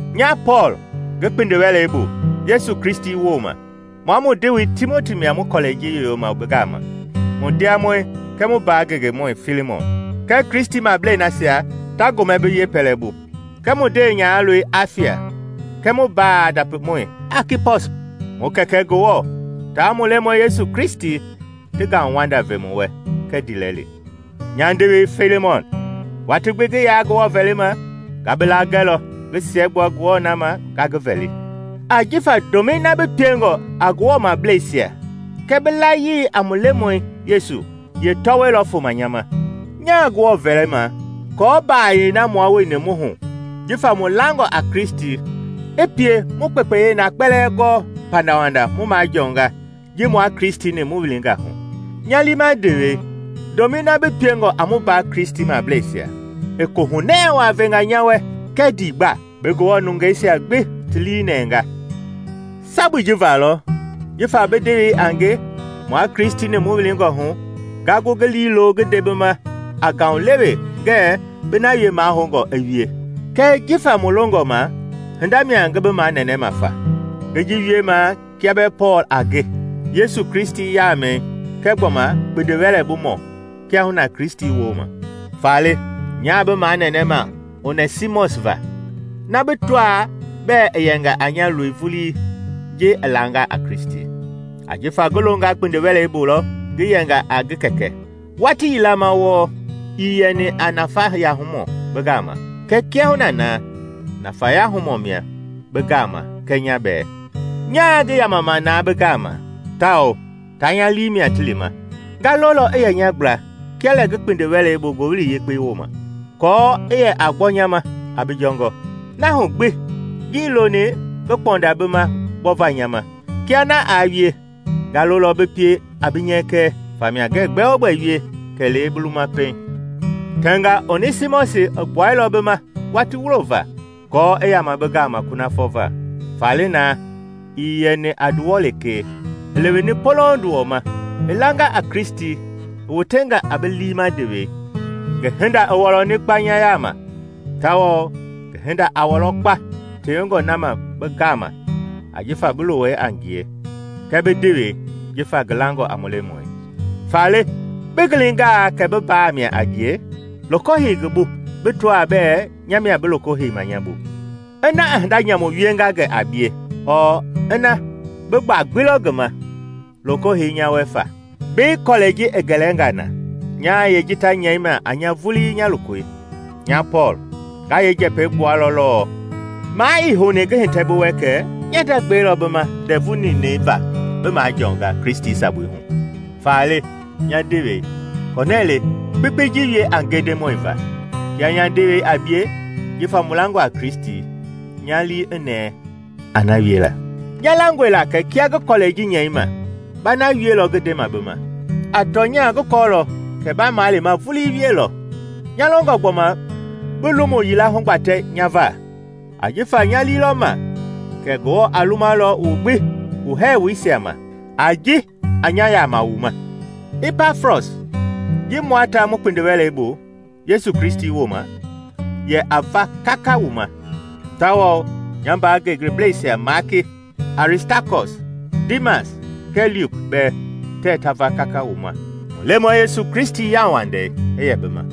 Nya Pɔɔl, ngi kpindi-wɛlei bu Yesu Kristi wooma, mua mu ndewei Timoti mia mu kɔlɛi ji yoyoma bi gama, mu ndiamɔi kɛɛ mu mbaa ngengemɔi Failimɔn, kɛɛ Kristimablei nasia ta gomɛ bi yeepɛlɛbu, kɛɛ mu ndewenyahaloi Afia kɛɛ mu mbaa ndapimɔi Akipɔs: Mu Kɛkɛ Ngewɔ taa mu Lemɔi Yesu Kristi ti ngauwanda ve wu wɛ kɛɛ ndiilɛli. Nya ndewei Failimɔn, watii gbi ngi yaa Ngewɔ vɛlima, nga bi laa gɛlɔ ngi siɛgbua Ngewɔ na ma nga ngi vɛli. Ajifa ndomɛi na bi piengɔ a Ngewɔmableisia kɛɛ bi layii a mu Lemɔi Yesu yeetɔwɔi lɔ foma nya ma. Nyaa Ngewɔ vɛlima aako mbaayɛi na mua wueni mu hu jifa mu langɔ a Kristi i pie mu kpekpeyei na kpɛlɛɛ gɔɔ pandawanda mu majɔɔnga ji mua Kristi-ni mu wilingɔ hu. Nya liima ndewei, ndomɛi na bi piengɔ a mu mbaa Kristimableisia, i koohunɛɛ waa venga nya wɛ kɛɛ ndiigba! Bi Ngewɔ nungeisia gbi ti lii nɛnga. Sabui ji va lɔ, jifa bi ndewei a nge mua Kristi-ni mu wilingɔ hu, nga gu ngi liilo ngi nde bi ma a ngaulewe ngɛɛ bi na wie mahoungɔ i wie. Kɛɛ jifa mu longɔ ma hinda mia ngi bi manɛnɛma fa. Ngi ji wiemaa kia bɛɛ Pɔɔl a nge, Yesu Kristi yaamɛi kɛɛ gbɔma kpindiwɛlɛbumɔ kiahuna Kristi wooma. Faale nyaa bi manɛnɛma Onɛsimɔsi va, na bi tɔaa bɛɛ i yɛnga a nya loi vulii ji i langa a Kristi; ajifa ngi longa kpindi-wɛlei bu lɔ ngi yɛnga a ngi kɛkɛ. Watii yila ma wɔɔ ii yɛni a nafayahumɔ bi gama, kɛɛ kiahuna na nafayahumɔ mia bi gama kɛɛ nya bɛɛ. Nyaa ngi yamama na bi gama, tawao taa nya lii mia ti lima. Nga lolɔ i yɛ nya gbla kia lɛ ngi kpindiwɛlei bu Ngowili Yekpei wooma, aako i yɛ a gbɔ nya ma a bi jɔngɔ. Na hu gbi, ngii loni ngi kpɔnda bi ma gbɔva nya ma; kia na aa wie, nga lolɔ bi pie a bi nyɛkɛ. Famia ngɛɛ gbɛogbɛ wie kɛlee bi luma pɛiŋ. Tɛnga Onɛsimɔsi i gbuailɔ bi ma watii wulo va aako i yama bi gama kunafɔ va. Faale na, ii yɛni a nduwɔ lekee, i leweni polouŋ nduwɔ ma: i langa a Kristi i wotenga a bi liima ndewei. Ngi hinda i wɔlɔni kpa nya yaama! Tawao ngi hinda a wɔlɔ kpa tewengɔ na ma bi gama jifa bi luwɔi a ngie kɛɛ bi ndewei jifa ngi langɔ a mu Lemɔi! Faale, bi gilingaa kɛ bi mbaa mia a nge, loko hei ngi bu bi tɔaa bɛɛ nya mia bi loko heima nya bu. Ina i hinda nyamu wienga gɛ a bie ɔɔ ina bi gbaa gbi lɔ ngi ma, loko hei nya wɛ fa. Mbei kɔlɛi ji i gɛlɛnga na, nyaa yeeji ta nyɛima a nya vulii nya lokoi: Nya Pɔɔl nga yeekpɛi gbualɔ lɔɔ. (Maa ii houni ngi hitɛ bi wɛ kɛ nya nda gbɛi lɔ bi ma ndɛvu ninɛi va bi majɔɔnga Kristi sabui hu.) Faale, nya ndewei, kɔnɛɛ le kpekpei ji wie a nge Ndemɔi va; kia nya ndewei a bie jifa mu langɔ a Kristi, nya lii i nɛɛ a na wiela. Nya langɔe la kɛ kia ngi kɔlɛi ji nyɛima, ba na wielɔ ngi ndema bi ma; a tɔnya ngi kɔɔlɔ kɛ ba malema vulii wielɔ. Nya longɔ gbɔma bi lomu yila hugbatɛ nya va, ajifa nya lii lɔ ma kɛ Ngewɔ a lumalɔ wu gbi wu hɛɛwoisia ma, a ji a nya yama wu ma. Ipafras ji mua ta mu kpindiwɛlei bu Yesu Kristi wooma, yɛ a va kaka wu ma, tawao nya mbaa ngengeblɛisia Maaki, Aristakɔs, Diimas kɛɛ Luki bɛɛ tɛɛ ta va kaka wu ma. Mu Lemɔi Yesu Kristi yauwandei i yɛ bi ma.